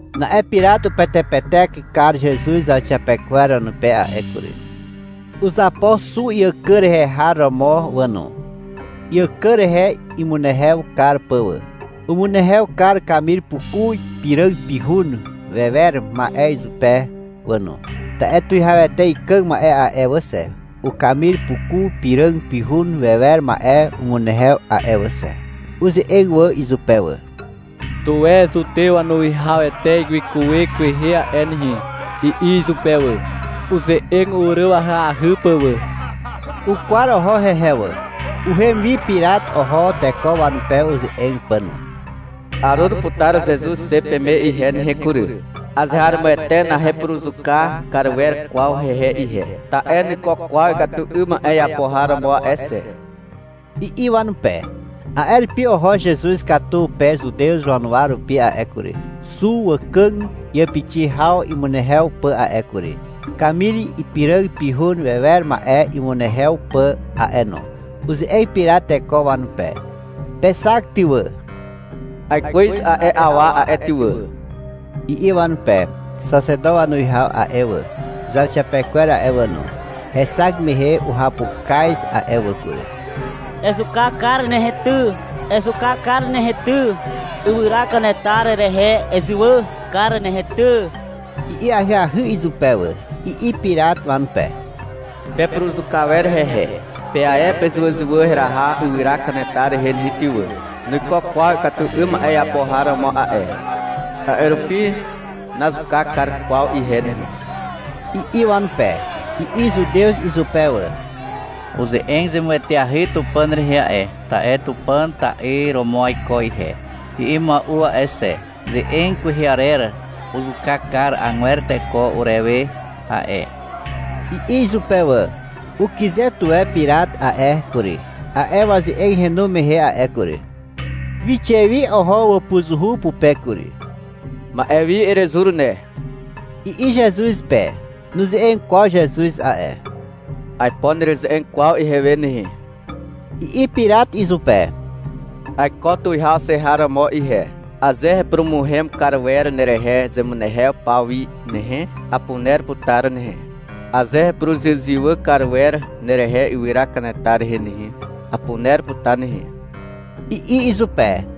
Na'e Pirat upetepetek kar Zezuz zauxiapekwer wanupe a'e kury. Uzapo xu iàkàg rehe har romo wà no, iàkàg rehe imunehew kar pà wà. Umunehew kar kamir puku ipiràg pihun wewer ma'e izupe wà no, (ta'e tuwihawete ikàg ma'e a'e wà xe, ukamir puku piràg pihun wewer ma'e umunehew a'e wà xe). Uze'eg wà izupe wà. — Tuwe Zutew wanuwihawete wikuwe kwehe a'e nehe, i'i izupe wà, uze'eg uryw ahyahy pà wà. Ukwar oho hehe wà. Uhem wi Pirat oho teko wanupe uze'eg pà no. — Arur putar Zezuz xe peme ihe nehe kury. Azeharomoete nahepuruzuka kar wer kwaw hehe ihe, ta'e nuiko kwaw ikatu 'ym ma'e iapo har romo a'e xe, i'i wanupe. A'e rupi oho Zezuz katu pe Zutew wanuwa rupi a'e kury, xu wàkàg iàpixi haw imunehew pà a'e kury, kamir ipiràg pihun wewer ma'e imunehew pà a'e no. Uze'eg Pirat teko wanupe. — Pexak ty wà. Aikwez a'e awa a'e ty wà, i'i wanupe. Xaxeto wanuwihaw a'e wà, zauxiapekwer a'e wà no, hexak mehe uhapukaz a'e wà kury. — Ezuka kar nehe ty, ezuka kar nehe ty, ywyra kanetar rehe ezywà kar nehe ty, i'i ahyahy izupe wà. I'i Pirat wanupe. — Pepuruzuka wer hehe. Pe ae pezywàzywà heraha ywyra kanetar rehe nehe ty wà. Nuiko kwaw ikatu 'ym ma'e iapo har romo a'e, a'e rupi nazuka kar kwaw ihe nehe, i'i wanupe. I'i Zutew izupe wà. — Uze'eg zemueteahy Tupàn rehe a'e, ta'e — Tupàn ta'yr romo aiko ihe, i'i mua'u a'e xe. Ze'eg kwehe arer uzuka kar agwer teko urewe a'e, i'i izupe wà. Ukyze tuwe Pirat a'e kury, a'e waze'eg henu mehe a'e kury. Wixe wi oho wàpuzuhu pupe kury. Ma'e wi erezur ne, i'i Zezuz pe. Nuze'eg kwaw Zezuz a'e. — Aipo nereze'eg kwaw ihewe nehe, i'i Pirat izupe. — Aiko tuwihaw xe har romo ihe. Aze hepurumuhem kar wer nerehe zemunehew paw wi nehe, apuner putar nehe. Aze hepuruzywàzywà kar wer nerehe ywyra kanetar rehe nehe, apuner putar nehe, i'i izupe.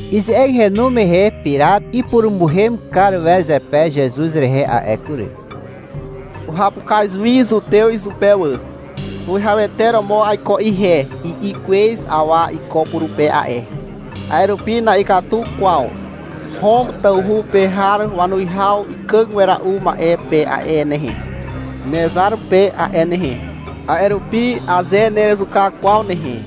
Ize'eg henu mehe Pirat ipurumuhem kar wer zepe Zezuz rehe a'e kury. Uhapukaz wi zutew izupe wà. — Tuwihawete romo aiko ihe, i'i kwez awa iko purupe a'e. A'e rupi na'ikatu kwaw Hom tawhu pe har wanuwihaw ikàg wera'u ma'e pe a'e nehe, nezar pe a'e nehe. A'e rupi aze nerezuka kwaw nehe,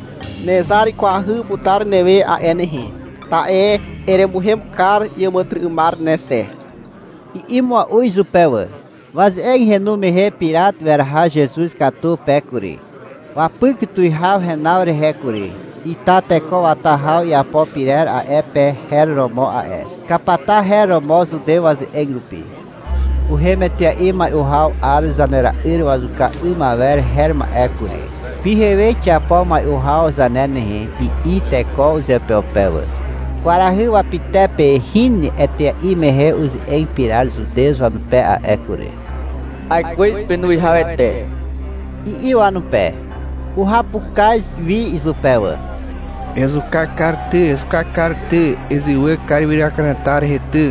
nezar wikwahy putar newe a'e nehe, ta'e eremuhem kar iàmàtyry'ymar ne xe, i'i mua'u izupe wà. Waze'eg henu mehe Pirat weraha Zezuz katu pe kury. Wapyk tuwihaw henaw rehe kury. Ita teko wata haw iapo pyrer a'e pe her romo a'e. (Kapata her romo zutew waze'eg rupi.) (Uhem etea'i mai'u haw 'ar Zanera'yr Wazuka 'ym Awer her ma'e kury. — Pyhewe xiapo mai'u haw zane nehe, i'i teko uzeupeupe wà.) Kwarahy wapytepe hin etea'i mehe uze'eg Pirat Zutew wanupe a'e kury. — Aikwez penuwihawete, i'i wanupe. Uhapukaz wi izupe wà. — Ezuka kar ty, ezuka kar ty, ezywà kar ywyra kanetar rehe ty,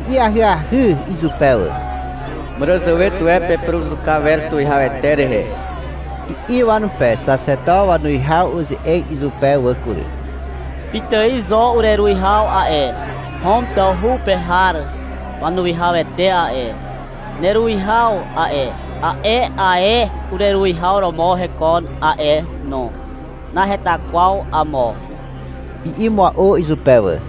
i'i ahyahy izupe wà. — Màràzàwe tuwe pepuruzuka wer tuwihawete rehe, i'i wanupe. Xaxeto wanuwihaw uze'eg izupe wà kury. — Pitài zo ureruwihaw a'e. Hom tawhu pe har wanuwihawete a'e, neruwihaw a'e, a'e ae ureruwihaw romo hekon a'e no, naheta kwaw amo, i'i mua'u izupe wà.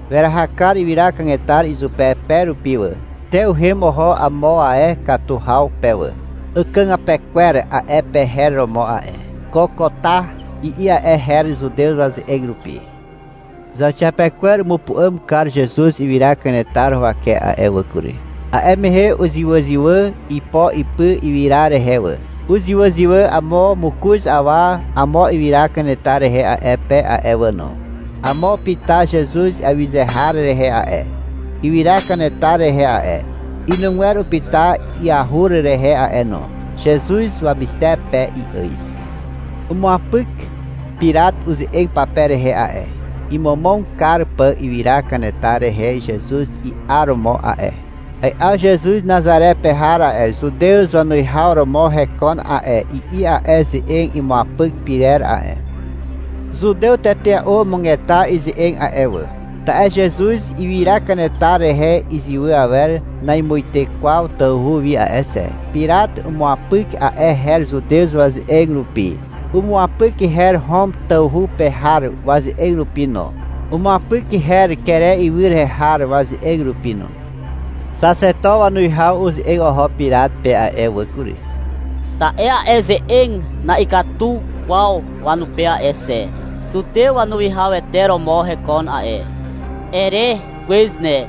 Weraha kar ywyra kanetar izupe pe rupi wà. Te uhem oho amo ae katu haw pe wà. Àkàgàpe kwer a'e pe her romo a'e. (Kokota, i'i a'e her Zutew waze'eg rupi.) Zauxiapekwer umupu'àm kar Zezuz ywyra kanetar huwake a'e wà kury. A'e mehe uzywàzywà ipo ipy ywyra rehe wà. Uzywàzywà amo mokoz awa amo ywyra kanetar rehe a'e pe a'e wà no. Amo upyta Zezuz iawyze har rehe a'e, ywyra kanetar rehe a'e. Inugwer upyta iahur rehe a'e no. Zezuz wamytepe i'àz. Umuapyk Pirat uze'eg pape rehe a'e, imomog kar pà ywyra kanetar rehe Zezuz i'aromo a'e. — Ai'aw Zezuz Nazare pe har a'e, Zutew wanuwihaw romo hekon a'e, i'i a'e ze'eg imuapyk pyrer a'e. Zutew tetea'u umugeta ize'eg a'e wà. Ta'e Zezuz ywyra kanetar rehe izywà awer namuite kwaw tawhu wi a'e xe. Pirat umuapyk a'e her zutew waze'eg rupi, umuapyk her Hom tawhu pe har waze'eg rupi no, umuapyk her Kere ywy rehe har waze'eg rupi no. Xaxeto wanuwihaw uze'eg oho Pirat pe a'e wà kury, ta'e a'e ze'eg na'ikatu kwaw wanupe a'e xe. — Zutew wanuwihawete romo hekon a'e, ere kwez ne,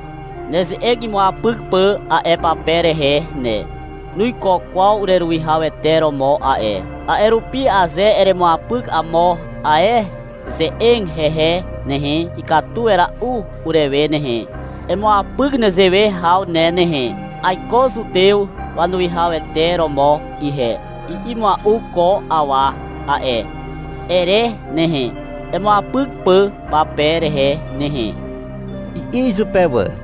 neze'eg imuapyk pà a'e pape rehe ne. Nuiko kwaw ureruwihawete romo a'e. A'e rupi aze eremuapyk amo ae ze'eg hehe nehe, ikatu wera'u urewe nehe. Emuapyk nezewe haw ne nehe. — Aiko Zutew wanuwihawete romo ihe, i'i mua'u ko awa a'e, ere nehe, imuapyk pà pape rehe nehe, i'i izupe wà.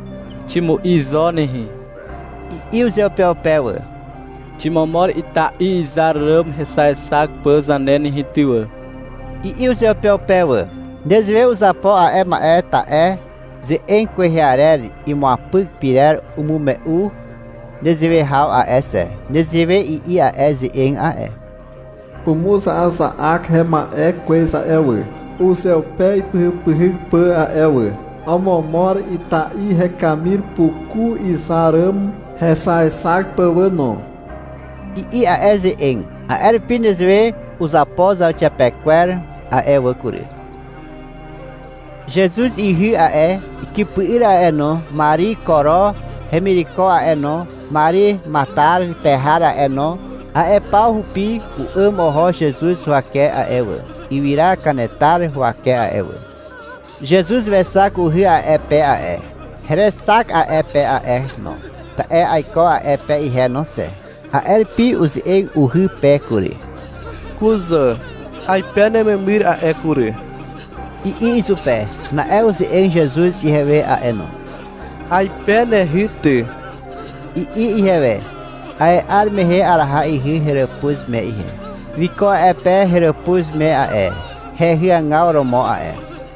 — Ximu'i zo nehe, i'i uzeupeupe wà. — Ximomor ita'i izar ràm hexaexak pà zane nehe ty wà, i'i uzeupeupe wà. Nezewe uzapo a'e wà, ta'e ze'eg kwehe arer imuapyk pyrer umume'u nezewe haw a'e xe. Nezewe i'i a'e ze'eg a'e. — Umuza'aza'ak hema'e kwez a'e wà, uzeupe ipyhypyhyk pà a'e wà. Omomor ita'i hekamir puku izar ràm hexaexak pà wà no, i'i a'e ze'eg. A'e rupi nezewe uzapo zauxiapekwer a'e wà kury. Zezuz ihy a'e, ikypy'yr a'e no, Mari Koro hemireko a'e no, Mari Matar pe har a'e no, a'e paw rupi u'àm oho Zezuz huwake a'e wà, ywyra kanetar huwake a'e wà. Zezuz wexak uhy a'e pe a'e. Herexak a'e pe a'e no, ta'e aiko a'e pe ihe no xe. A'e rupi uze'eg uhy pe kury. — Kuzà, 'aipe nememyr a'e kury, i'i izupe. Na'e uze'eg Zezuz ihewe a'e no. — 'Aipe nehy ty, i'i ihewe. A'e 'ar mehe araha ihy heràpuz me ihe. Wiko a'e pe heràpuz me a'e, hehy agaw romo a'e.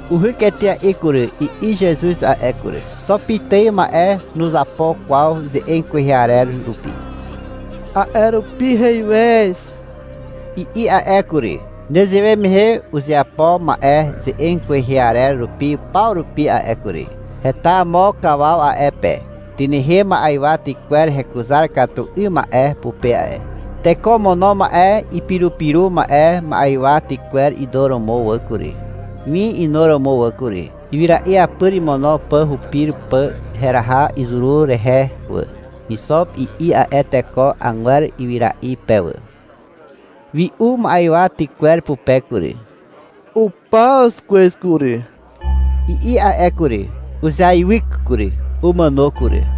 — Uhyk etea'i kury, i'i Zezuz a'e kury. Xo pitài ma'e nuzeapo kwaw ze'eg kwehe arer rupi. A'e rupi — Heiwez, i'i a'e kury. Nezewe mehe uzeapo ma'e ze'eg kwehe arer rupi paw rupi a'e kury. Heta amo kawaw a'e pe. Tynehem ma'ywa tykwer hekuzar katu 'ym ma'e pupe a'e. Teko omono ma'e ipirupiru ma'e ma'ywa tykwer inuromo wà kury, (win inuromo wà kury), ywyra'i apyr imono pà hupir pà heraha izuru rehe wà. — Ixop, i'i a'e teko agwer ywyra'i pe wà. Wi'u ma'ywa tykwer pupe kury. — Upaw kwez kury, i'i a'e re kury. Uzeaiwyk kury. Umàno kury.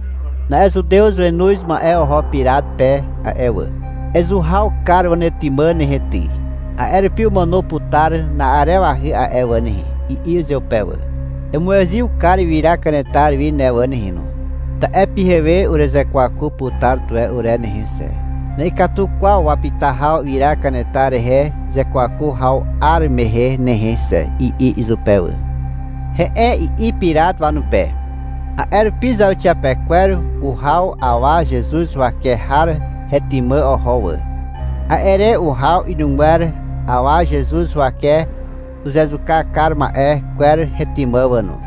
Na'e zutew wenoz ma'e oho Pirat pe a'e wà. — Ezuhaw kar wanetymà nehe ty. A'e rupi umàno putar na'arewahy a'e wà nehe, i'i izupe wà. — Emuezyw kar ywyra kanetar wi ne wà nehe no. Ta'e pyhewe uruzekwaku putar tuwe ure nehe xe. Na'ikatu kwaw wapyta haw ywyra kanetar rehe zekwaku haw 'ar mehe nehe xe, i'i izupe wà. — He'e, i'i Pirat wanupe. A'e rupi zauxiapekwer uhaw awa Zezuz huwake har hetymà oho wà. A'e re uhaw inugwer awa Zezuz huwake uzezuka kar ma'e kwer hetymà wà no.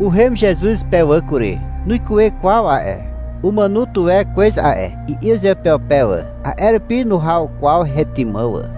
Uhem Zezuz pe wà kury. Nuikuwe kwaw a'e. — Umàno tuwe kwez a'e, i'i uzeupeupe wà. A'e rupi nuhaw kwaw hetymà wà.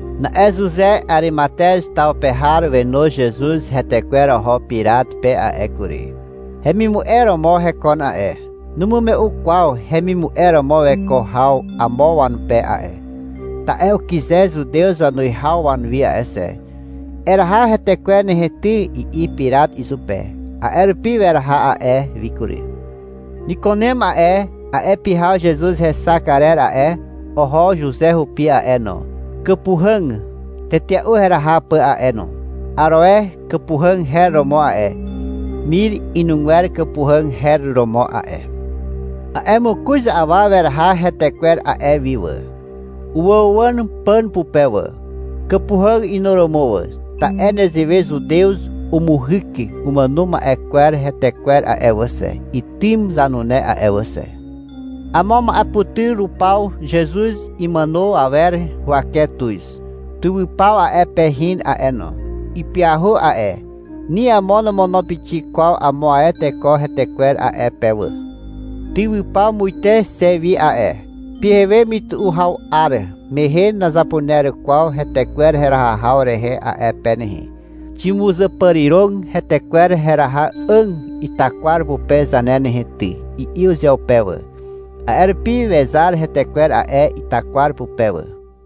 Na'e Zuze Arimatez taw pe har wenoz Zezuz hetekwer oho Pirat pe a'e kury. (Hemimu'e romo hekon a'e. Numume'u kwaw hemimu'e romo weko haw amo wanupe a'e, ta'e ukyze Zutew wanuwihaw wanuwi a'e xe.) — Eraha hetekwer nehe ty, i'i Pirat izupe. A'e rupi weraha a'e wi kury. Nikunem a'e, a'e pyhaw Zezuz hexak arer a'e, oho Zuze hupi a'e no, kàpuhàg tetea'u heraha pà a'e no. Aroe kàpuhàg her romo a'e. Mir inugwer kàpuhàg her romo a'e. A'e mokoz awa weraha hetekwer a'e wi wà. Uwàuwàn pàn pupe wà, kàpuhàg inuromo wà. (Ta'e nezewe Zutew umuhyk umàno ma'e kwer hetekwer a'e wà xe, itym zanune a'e wà xe.) Amo ma'eputyr rupaw Zezuz imàno awer huwake tuz. Tywypaw a'e pe hin a'e no. Ipyahu a'e. Ni amo nomono pixik kwaw amo ae teko hetekwer a'e pe wà. — Tywypaw muite xe wi a'e, pyhewe mytu'u haw 'ar mehe nazapuner kwaw hetekwer heraha haw rehe a'e pe nehe. Ximuzàpàriràg hetekwer heraha 'àg itakwar pupe zane nehe ty, i'i uzeupeupe wà. A'e rupi wezar hetekwer a'e itakwar pupe wà.